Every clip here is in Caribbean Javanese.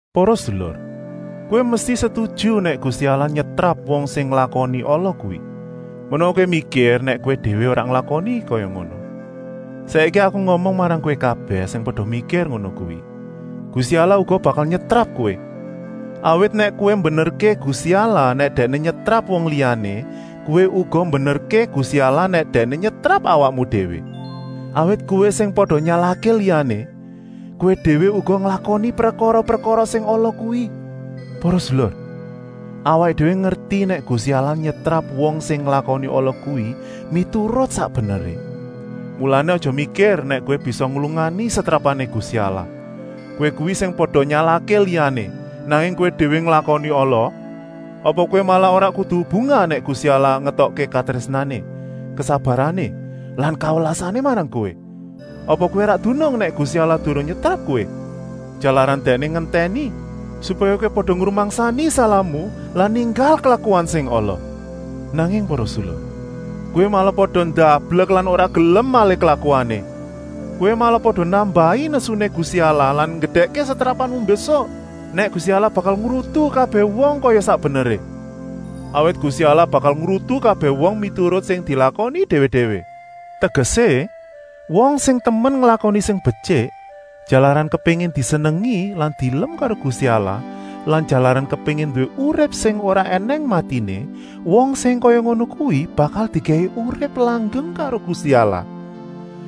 Para sedulur, kowé mesti setuju nèk Gusti Allah nyetrap wong sing nglakoni ala kuwi. Menawa kowé mikir nèk kowé déwé ora nglakoni kaya ngono. Saiki aku ngomong marang kowé kabèh sing pada mikir ngono kuwi: Gusti Allah uga bakal nyetrap kowé. Awit nèk kowé mbenerké Gusti Allah nèk Dèkné nyetrap wong liyané, kowé uga mbenerké Gusti Allah nèk Dèkné nyetrap awakmu déwé. Awit kowé sing pada nyalahké liyané, kowé déwé uga nglakoni prekara-prekara sing ala kuwi. Para sedulur, awaké déwé ngerti nèk Gusti Allah nyetrap wong sing nglakoni ala kuwi miturut sak beneré. Mulané aja mikir nèk kowé bisa nglungani setrapané Gusti Allah, kowé kuwi sing pada nyalahké liyané, nanging kowé déwé nglakoni ala. Apa kowé malah ora kudu bungah nèk Gusti Allah ngétokké katrésnané, kesabarané lan kawelasané marang kowé. Apa kowé ora dunung nèk Gusti Allah durung nyetrap kowé, jalaran Dèkné ngentèni, supaya kowé pada ngrumangsani salahmu lan ninggal klakuan sing ala. Nanging para sedulur, kowé malah pada ndablek lan ora gelem malih klakuané. Kowé malah pada nambahi nesuné Gusti Allah lan nggedèkké setrapanmu mbésuk nèk Gusti Allah bakal ngrutu kabèh wong kaya sak beneré. Awit Gusti Allah bakal ngrutu kabèh wong miturut sing dilakoni déwé-déwé. Tegesé, wong sing temen nglakoni sing betyik, jalaran kepéngin disenengi lan dielem karo Gusti Allah lan jalaran kepéngin nduwé urip sing ora ènèng matiné, wong sing kaya ngono kuwi bakal dikèki urip langgeng karo Gusti Allah.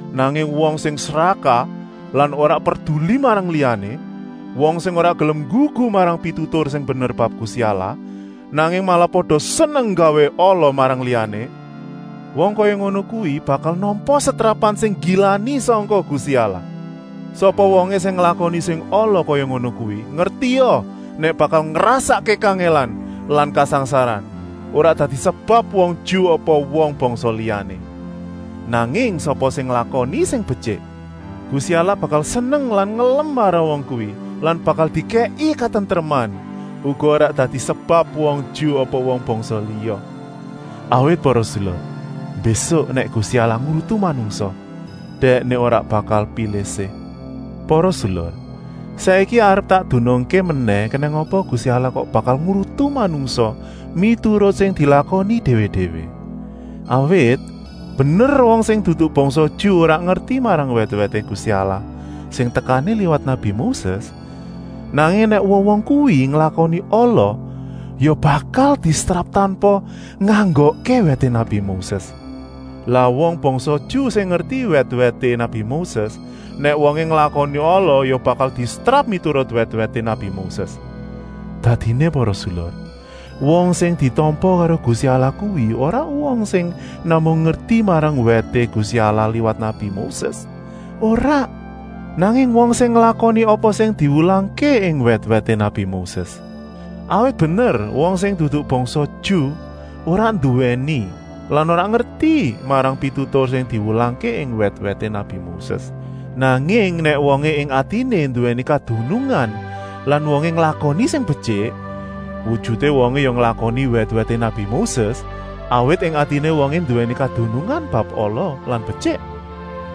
Nanging wong sing srakah lan ora perduli marang liyané, wong sing ora gelem nggugu marang pitutur sing bener bab Gusti Allah, nanging malah pada seneng nggawé ala marang liyané, wong kaya ngono kuwi bakal nampa setrapan sing nggilani sangka Gusti Allah. Sapa wongé sing nglakoni sing ala kaya ngono kuwi, ngertia nèk bakal ngrasakké kangèlan lan kasangsaran, ora dadi sebab wong Ju apa wong bangsa liyané. Nanging sapa sing nglakoni sing betyik, Gusti Allah bakal seneng lan ngelem marang wong kuwi lan bakal dikèki katentreman, uga ora dadi sebab wong Ju apa wong bangsa liya. Awit para sedulur, mbésuk nèk Gusti Allah ngrutu manungsa, Dèkné ora bakal pilih-sih. Para sedulur, saiki arep tak dunungké menèh kenèng apa Gusti Allah kok bakal ngrutu manungsa miturut sing dilakoni déwé-déwé. Awit, bener wong sing dudu bangsa Ju ora ngerti marang wèt-wèté Gusti Allah sing tekané liwat nabi Moses, nanging nèk wong-wong kuwi nglakoni ala ya bakal disetrap tanpa nganggokké wèté nabi Moses. Lah wong bangsa Ju sing ngerti wèt-wèté nabi Moses, nèk wongé nglakoni ala ya bakal disetrap miturut wèt-wèté nabi Moses. Dadiné para sedulur, wong sing ditampa karo Gusti Allah kuwi ora wong sing namung ngerti marang wèté Gusti Allah liwat nabi Moses, ora, nanging wong sing nglakoni apa sing diwulangké ing wèt-wèté nabi Moses. Awit bener wong sing dudu bangsa Ju ora nduwèni lan ora ngerti marang pitutur sing diwulangké ing wèt-wèté nabi Moses, nanging nèk wongé ing atiné nduwèni kadunungan lan wongé nglakoni sing betyik, wujuté wongé ya nglakoni wèt-wèté nabi Moses, awit ing atiné wongé nduwèni kadunungan bab ala lan betyik.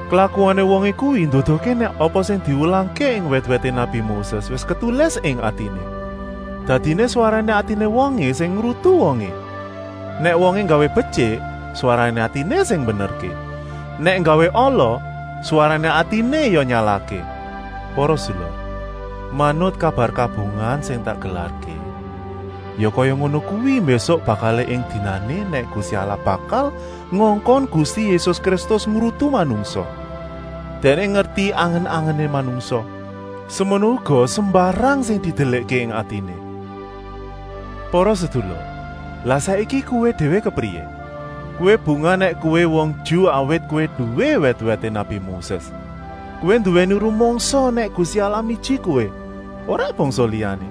Klakuané wongé kuwi nduduhké nèk apa sing diwulangké ing wèt-wèté nabi Moses wis ketulis ing atiné. Dadiné swarané atiné wongé sing ngrutu wongé. Nèk wongé nggawé betyik, swarané atiné sing mbenerké, nèk nggawé ala, swarané atiné ya nyalahké. Para sedulur, manut kabar kabungahan sing tak gelarké, ya kaya ngono kuwi mbésuk bakalé ing dinané nèk Gusti Allah bakal ngongkon Gusti Yésus Kristus ngrutu manungsa. Dèkné ngerti angen-angené manungsa, semono uga sembarang sing didelikké ing atiné. Para sedulur, lah saiki kowé déwé kepriyé. Kowé bungah nèk kowé wong Ju, awit kowé nduwé wèt-wèté nabi Moses. Kowé nduwèni rumangsa nèk Gusti Allah miji kowé, ora bangsa liyané.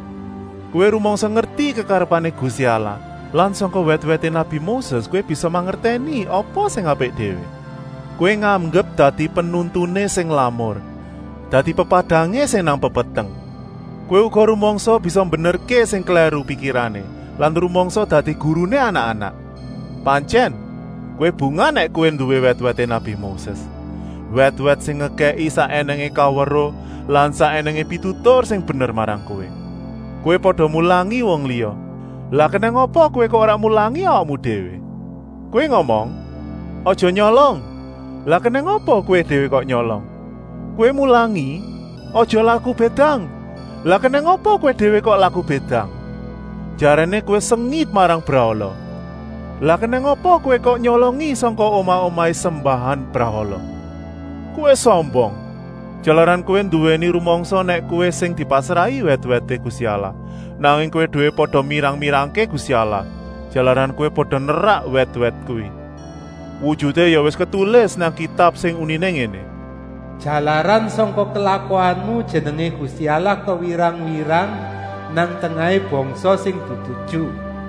Kowé rumangsa ngerti kekarepané Gusti Allah lan sangka wèt-wèté nabi Moses kowé bisa mangertèni apa sing apik déwé. Kowé nganggep dadi penuntuné sing lamur, dadi pepadangé sing nang pepeteng. Kowé uga rumangsa bisa mbenerké sing klèru pikirané lan rumangsa dadi guruné anak-anak. Pantyèn, kowé bungah nèk kowé nduwé wèt-wèté nabi Moses, wèt-wèt sing ngekèki sak ènèngé kaweruh lan sak ènèngé pitutur sing bener marang kowé. Kowé pada mulangi wong liya, lah kenèng apa kowé kok ora mulangi awakmu déwé? Kowé ngomong: “Aja nyolong,” lah kenèng apa kowé déwé kok nyolong? Kowé mulangi: “Aja laku bédang,” lah kenèng apa kowé déwé kok laku bédang? Jaréné kowé sengit marang brahala, lah kenèng apa kowé kok nyolongi sangka omah-omahé sembahan brahala? Kowé sombong, jalaran kowé nduwèni rumangsa nèk kowé sing dipasrahi wèt-wèté Gusti Allah, nanging kowé déwé pada mirang-mirangké Gusti Allah, jalaran kowé pada nerak wèt-wèt kuwi. Wujuté ya wis ketulis nang Kitab sing uniné ngéné: “Jalaran sangka klakuanmu jenengé Gusti Allah kewirang-wirang nang tengahé bangsa sing dudu Ju.”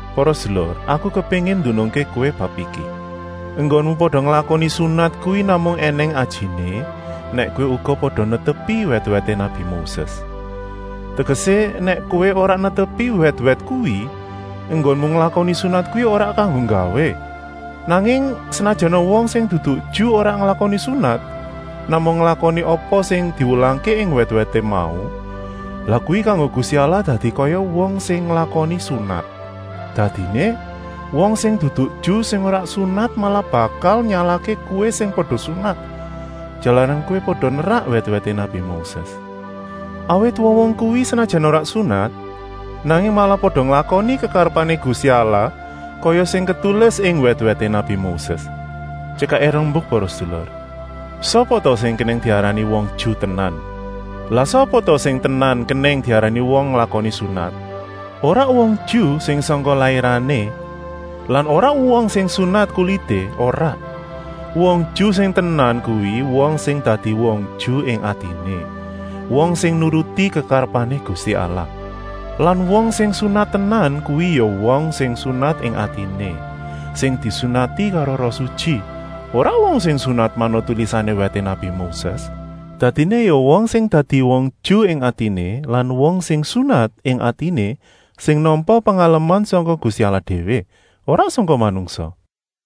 Para sedulur, aku kepéngin ndunungké kowé bab iki: enggonmu pada nglakoni sunat kuwi namung ènèng ajiné, nèk kowé uga pada netepi wèt-wèté nabi Moses. Tegesé, nèk kowé ora netepi wèt-wèt kuwi, enggonmu nglakoni sunat kuwi ora kanggo gawé. Nanging, senajana wong sing dudu Ju ora nglakoni sunat, namung nglakoni apa sing diwulangké ing wèt-wèt mau, lah kuwi kanggo Gusti Allah dadi kaya wong sing nglakoni sunat. Dadiné, wong sing dudu Ju sing ora sunat malah bakal nyalahké kowé sing pada sunat, jalaran kowé pada nerak wèt-wèté nabi Moses. Awit wong-wong kuwi senajan ora sunat, nanging malah pada nglakoni kekarepané Gusti Allah kaya sing ketulis ing wèt-wèté nabi Moses. Tyekaké rembuk para sedulur, sapa ta sing kenèng diarani wong Ju tenan. Lan sapa ta sing tenan kenèng diarani wong nglakoni sunat? Ora wong Ju sing sangka lairané lan ora wong sing sunat kulité, ora. Wong Ju sing tenan kuwi wong sing dadi wong Ju ing atiné, wong sing nuruti kekarepané Gusti Allah. Lan wong sing sunat tenan kuwi ya wong sing sunat ing atiné, sing disunati karo Roh Sutyi, ora wong sing sunat manut tulisané wèté nabi Moses. Dadiné ya wong sing dadi wong Ju ing atiné lan wong sing sunat ing atiné sing nampa pengaleman sangka Gusti Allah déwé, ora sangka manungsa.